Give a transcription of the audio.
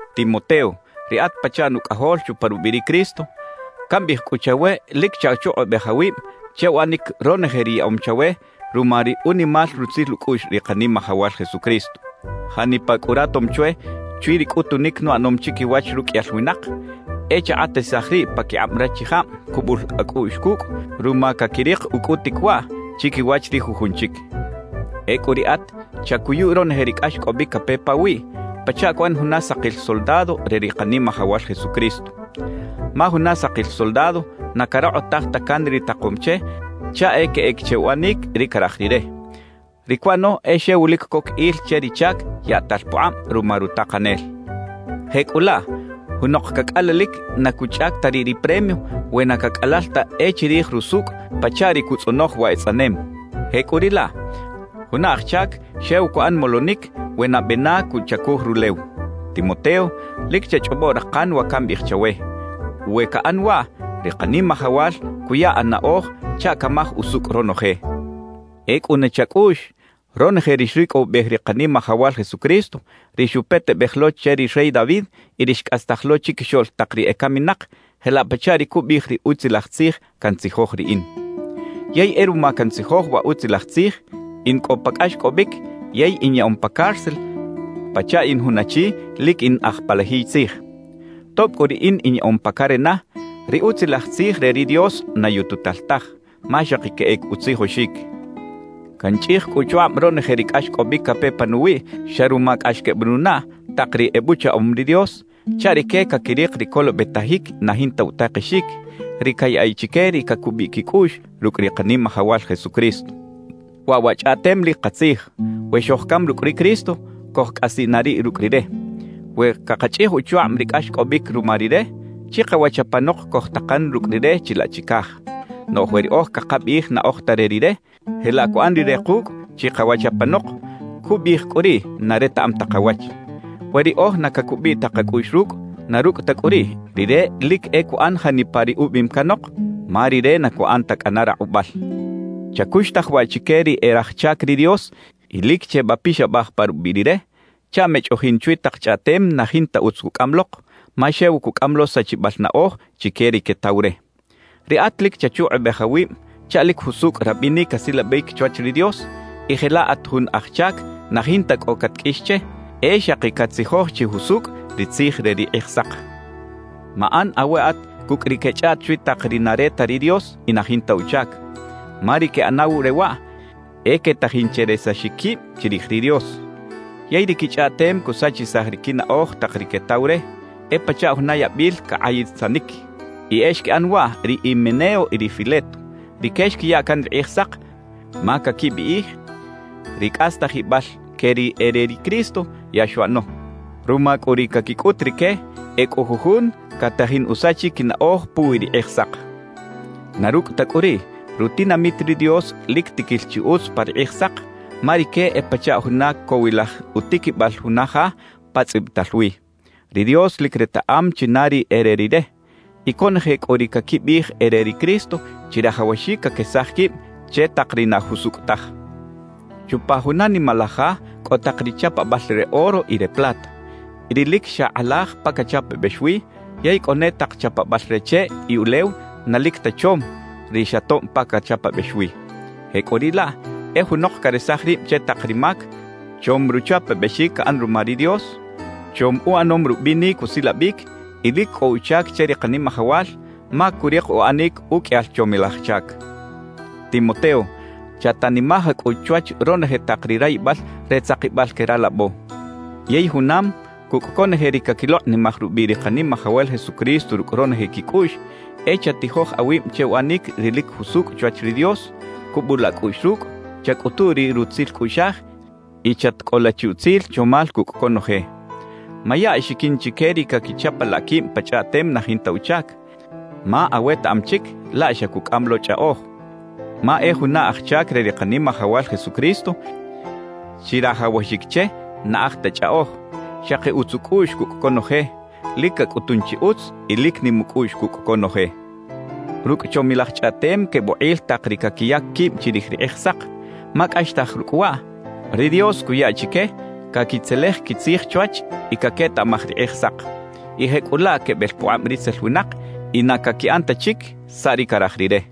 Timoteo, ri at pachaꞌ nucꞌajol chupa rubiꞌ ri Cristo. Cambiꞌij cꞌu chawe lic chachukꞌubej awib che uꞌanic ronoje ri yaꞌom chawe ruma ri unimal rutzil ucꞌuꞌx ri Kanimajawal Jesucristo. Janipa cꞌu ratom chwe chwi ri cꞌutunic nuꞌanom chiquiwach ruqꞌuiyal winak, e chakꞌatisaj riꞌ paquikꞌab rachijab cubul acꞌuꞌx cucꞌ ruma caquirik ucꞌutic waꞌ chiquiwach ri jujun chic. Ecꞌu riꞌat, chacuyu ronoje ri cꞌaxcꞌobic cape pawiꞌ pachaꞌ cuꞌan juna sakil soldado re ri Kanimajawal Jesucristo. Ma juna sakil soldado na carokꞌotaj ta can ri takom che chaꞌ e queꞌec che uꞌanic ri caraj rire; ri cuꞌano e xew lic coc il che ri chac yaꞌtal pukꞌab ruma rutakanel. Jecꞌulaꞌ, junok cacꞌalalic na cuchꞌac ta riꞌ ri premio we na cacꞌalal ta e chirij rusucꞌ pachaꞌ ri cutzꞌonoj wa etzꞌanem. Jecꞌuriꞌlaꞌ, juna aj chac xew cuꞌan molonic we nabe na cuchacuj rulew. Timoteo, lic chachꞌobo rakan wa cambiꞌij chawe; we caꞌan waꞌ, ri Kanimajawal cuya anaꞌoj chaꞌ camaj usucꞌ ronoje. E cꞌuna chacꞌuꞌx ronoje ri xricꞌowibej ri Kanimajawal Jesucristo, ri xupetebej lo che ri rey David y ri xcꞌastaj lo chiquixoꞌl tak ri ecaminak jelaꞌ pachaꞌ ri cubiꞌij ri Utzilaj Tzij cantzijoj riꞌin. Yey e ruma cantzijoj wa Utzilaj Tzij, in cꞌo pa cꞌaxcꞌobic yey inyaꞌom pa cárcel pachaꞌ in jun achi lic in aj palajiy tzij. Tob cꞌu riꞌin inyaꞌom pa carena, ri Utzilaj Tzij re ri Dios na yututal taj, ma xaki queꞌec utzijoxic. Canchꞌij cꞌu uchukꞌab ronoje ri cꞌaxcꞌobic cape panuwiꞌ xa ruma cꞌax quebenunaꞌ tak ri ebuchaꞌom ri Dios, chaꞌ rique caquirik ri colobetajic na jinta utakexic, ri cayaꞌiꞌ chique ri cacubiꞌ quicꞌuꞌx rucꞌ ri Kanimajawal Jesucristo. Waꞌ wa chꞌaꞌtem lic katzij: We xojcam rucꞌ ri Cristo, cojcꞌasiꞌ na riꞌ rucꞌ Rire. We cakachꞌij uchukꞌab ri cꞌaxcꞌobic ruma Rire, chikawach apanok cojtakan rucꞌ Rire chilaꞌ chicaj. Noꞌj we riꞌoj cakabiꞌij na oj ta re Rire, jelaꞌ cuꞌan Rire kucꞌ chikawach apanok, cubiꞌij cꞌu riꞌ na retaꞌam ta kawach. We riꞌoj na cacubiꞌ ta kacꞌuꞌx rucꞌ; na rucꞌ ta cꞌu riꞌ, Rire lic e cuꞌan janipa ri ubiꞌim canok, ma Rire na cuꞌan ta cꞌana rakꞌubal. Chacuxtaj waꞌ chique ri e raj chac ri Dios y lic chebapixabaj pa rubiꞌ Rire, chaꞌ mechꞌoꞌjin chwi tak chꞌaꞌtem na jinta utz cucꞌam lok, ma xew cucꞌam lo sachibal naꞌoj chique ri quetaw re. Riꞌat lic chachukꞌubej awib chaꞌ lic jusucꞌ rabinic asilabic chwach ri Dios y jelaꞌ at jun aj chac na jinta cꞌo catqꞌuix che, e xaki catzijoj chi jusucꞌ ri Tzij re ri Kꞌijsak. Maꞌan aweꞌat cucꞌ ri quechꞌaꞌt chwi tak ri na re ta ri Dios y na jinta uchac. Ma ri queꞌanaw re waꞌ, e quetajin che resaxic quib chirij ri Dios. Yey ri quichꞌaꞌtem cusachisaj ri quinaꞌoj tak ri quetaw re, e pachaꞌ juna yabil cakꞌayisanic. Y e xquiꞌan waꞌ ri Himeneo y ri Fileto. Rique xquiya can ri Kꞌijsak ma caquibiꞌij ri cꞌastajibal que ri e re ri Cristo, ya xuꞌano. Ruma cꞌu ri caquicꞌut rique, e cꞌo jujun catajin usachic quinaꞌoj puwi ri Kꞌijsak. Na rucꞌ ta cꞌu riꞌ, rutinamit ri Dios lic tiquil chi utz pa ri Kꞌijsak, ma rique e pachaꞌ juna cowilaj utiquibal juna ja pa tzꞌibital wi: «Ri Dios lic retaꞌam china ri e re Rire» y «Conoje cꞌu ri caquibiꞌij e re ri Cristo, chirajawaxic caquesaj quib che tak ri na jusucꞌ taj.» Chupa juna nimalaj ja cꞌo tak ri chapabal re oro y re plata, ri lic xa kꞌalaj pa cachapabex wi; yey cꞌo ne tak chapabal re cheꞌ y ulew na lic ta chom, ri xa tob pa cachapabex wi. Jecꞌuriꞌlaꞌ e junok caresaj rib che tak ri mac, chom ruchapabexic caꞌan ruma ri Dios, chom uꞌanom rubinic usilabic y lic cꞌo uchac che ri Kanimajawal, ma curik uꞌanic uqꞌuiyal chomilaj chac. Timoteo, chatanimaj cꞌu chwach ronoje tak ri rayibal re tzakibal que ralabo. Yey junam cucꞌ conoje ri caquilokꞌnimaj rubiꞌ ri Kanimajawal Jesucristo rucꞌ ronoje quicꞌuꞌx, e chatijoj awib che uꞌanic ri lic jusucꞌ chwach ri Dios, cubula acꞌuꞌx rucꞌ, chacꞌutu ri rutzil cꞌuꞌxaj y chatcꞌola chi utzil chomal cucꞌ conoje. Maya axiquin chique ri caquichapalaꞌ quib pa chꞌaꞌtem na jinta uchac, ma awetaꞌam chic laꞌ xa cucꞌam lo chꞌaꞌoj. Ma e juna aj chac re ri Kanimajawal Jesucristo chirajawaxic che na aj ta chꞌaꞌoj, xaki utz ucꞌuꞌx cucꞌ conoje, lic cacꞌutun chi utz y lic nim ucꞌuꞌx cucꞌ conoje. Rucꞌ chomilaj chꞌaꞌtem quebukꞌil tak ri caquiyac quib chirij ri Kꞌijsak; ma cꞌaxtaj rucꞌ waꞌ, ri Dios cuya chique caquitzelej quitzij chwach y caquetaꞌmaj ri Kꞌijsak, y jecꞌulaꞌ quebel pukꞌab ritzel winak y na caquiꞌan ta chic saꞌ ri caraj rire.